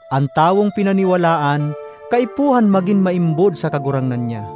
An tawong pinaniwalaan kaipuhan magin maimbod sa kagurangnan niya.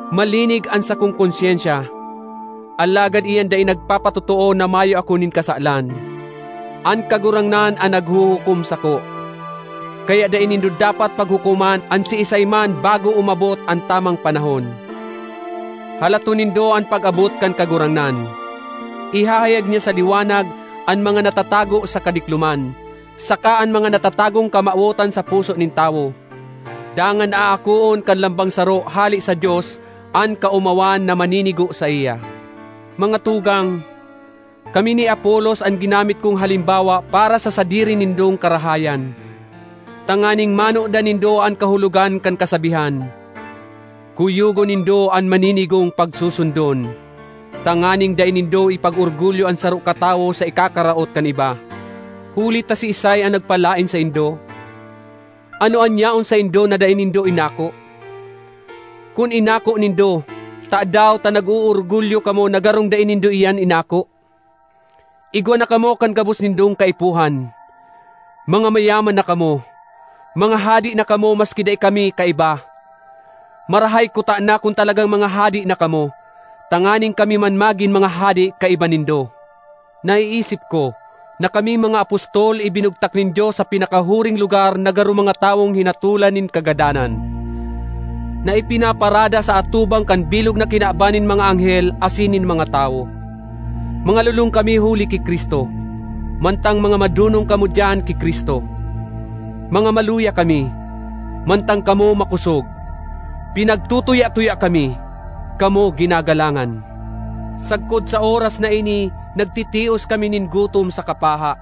Malinig an sakong konsyensya, alagad iyan dai nagpapatotoo na mayo ako nin kasalan. An Kagurangnan an naghuhukom sako. Kaya dai nindo dapat paghukoman an siisay man bago umabot an tamang panahon; halaton nindo an pag-abot kan Kagurangnan. Ihahayag niya sa liwanag an mga natatago sa kadikloman saka an mga natatagong kamawotan sa puso nin tawo. Dangan aakoon kan lambang saro hale sa Dios an kaomawan na maninigo saiya. Mga tugang, kami ni Apolos an ginamit kong halimbawa para sa sadiri nindong karahayan, tanganing manodan nindo an kahulogan kan kasabihan, “Kuyogon nindo an maninigong pagsusundon;” tanganing dai nindo ipag-orgulyo an saro katawo sa ikakaraot kan iba. Huli ta siisay an nagpalaen saindo? Ano an yaon saindo na dai nindo inako? Kun inako nindo, tadaw ta nag-oorgulyo kamo na garong dai nindo iyan inako? Igwa na kamo kan gabos nindong kaipuhan! Mga mayaman na kamo! Mga hade na kamo maski dai kami kaiba! Marahay kutana kun talagang mga hade na kamo, tanganing kami man magin mga hade kaiba nindo! Naiisip ko na kaming mga apostol ibinugtak nin Dios sa pinakahuring lugar na garo mga tawong hinatolan nin kagadanan, na ipinaparada sa atubang kan bilog na kinaban nin mga anghel asin nin mga tawo. Mga lolong kami huli ki Cristo, mantang mga madonong kamo diyan ki Cristo! Mga maluya kami, mantang kamo makosog! Pinagtutuya-tuya kami; kamo ginagalangan! Sagkod sa oras na ini nagtitios kami nin gutom saka paha;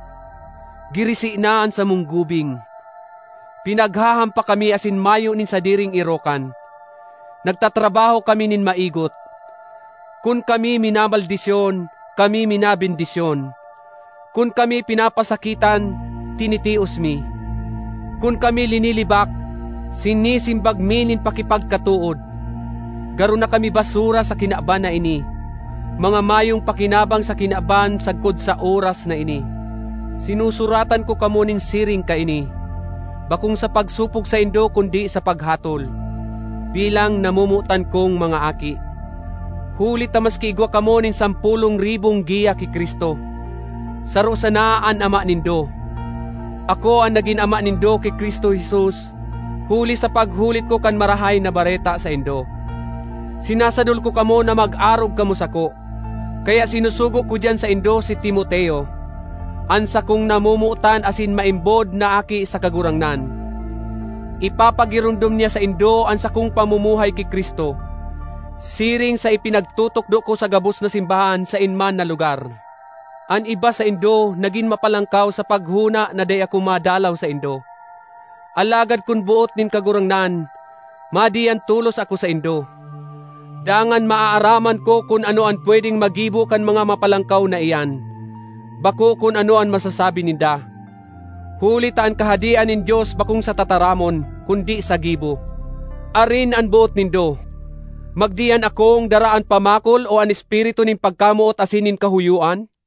girisi na an samong gubing. Pinaghahampak kami asin mayo nin sadiring erokan; nagtatrabaho kami nin maigot. Kun kami minamaldisyon, kami minabendisyon; kun kami pinapasakitan, tinitios mi; kun kami linilibak, sinisimbag mi nin pakipagkatood. Garo na kami basura sa kinaban na ini—mga mayong pakinabang sa kinaban sagkod sa oras na ini! Sinusuratan ko kamo nin siring kaini, bakong sa pagsopog saindo kundi sa paghatol, bilang namomotan kong mga aki. Huli ta maski igwa kamo nin sampolong ribong giya ki Cristo, saro sana an ama nindo. Ako an nagin ama nindo ki Cristo Jesus huli sa paghulit ko kan Marahay na Bareta saindo. Sinasadol ko kamo na mag-arog kamo sako. Kaya sinusugo ko diyan saindo si Timoteo, an sakong namomotan asin maimbod na aki sa Kagurangnan. Ipapagiromdom niya saindo an sakong pamumuhay ki Cristo, siring sa ipinagtutukdo ko sa gabos na simbahan saen man na lugar. An iba saindo nagin mapalangkaw sa paghona na dai ako madalaw saindo. Alagad kun boot nin Kagurangnan, madiyan tolos ako saindo. Dangan maaaraman ko kun ano an pwedeng magibo kan mga mapalangkaw na iyan, bako kun ano an masasabi ninda. Huli ta an Kahadean nin Dios bakong sa tataramon, kundi sa gibo. Arin an boot nindo: magdiyan akong dara an pamakol o an espiritu nin pagkamoot asin nin kahoyoan?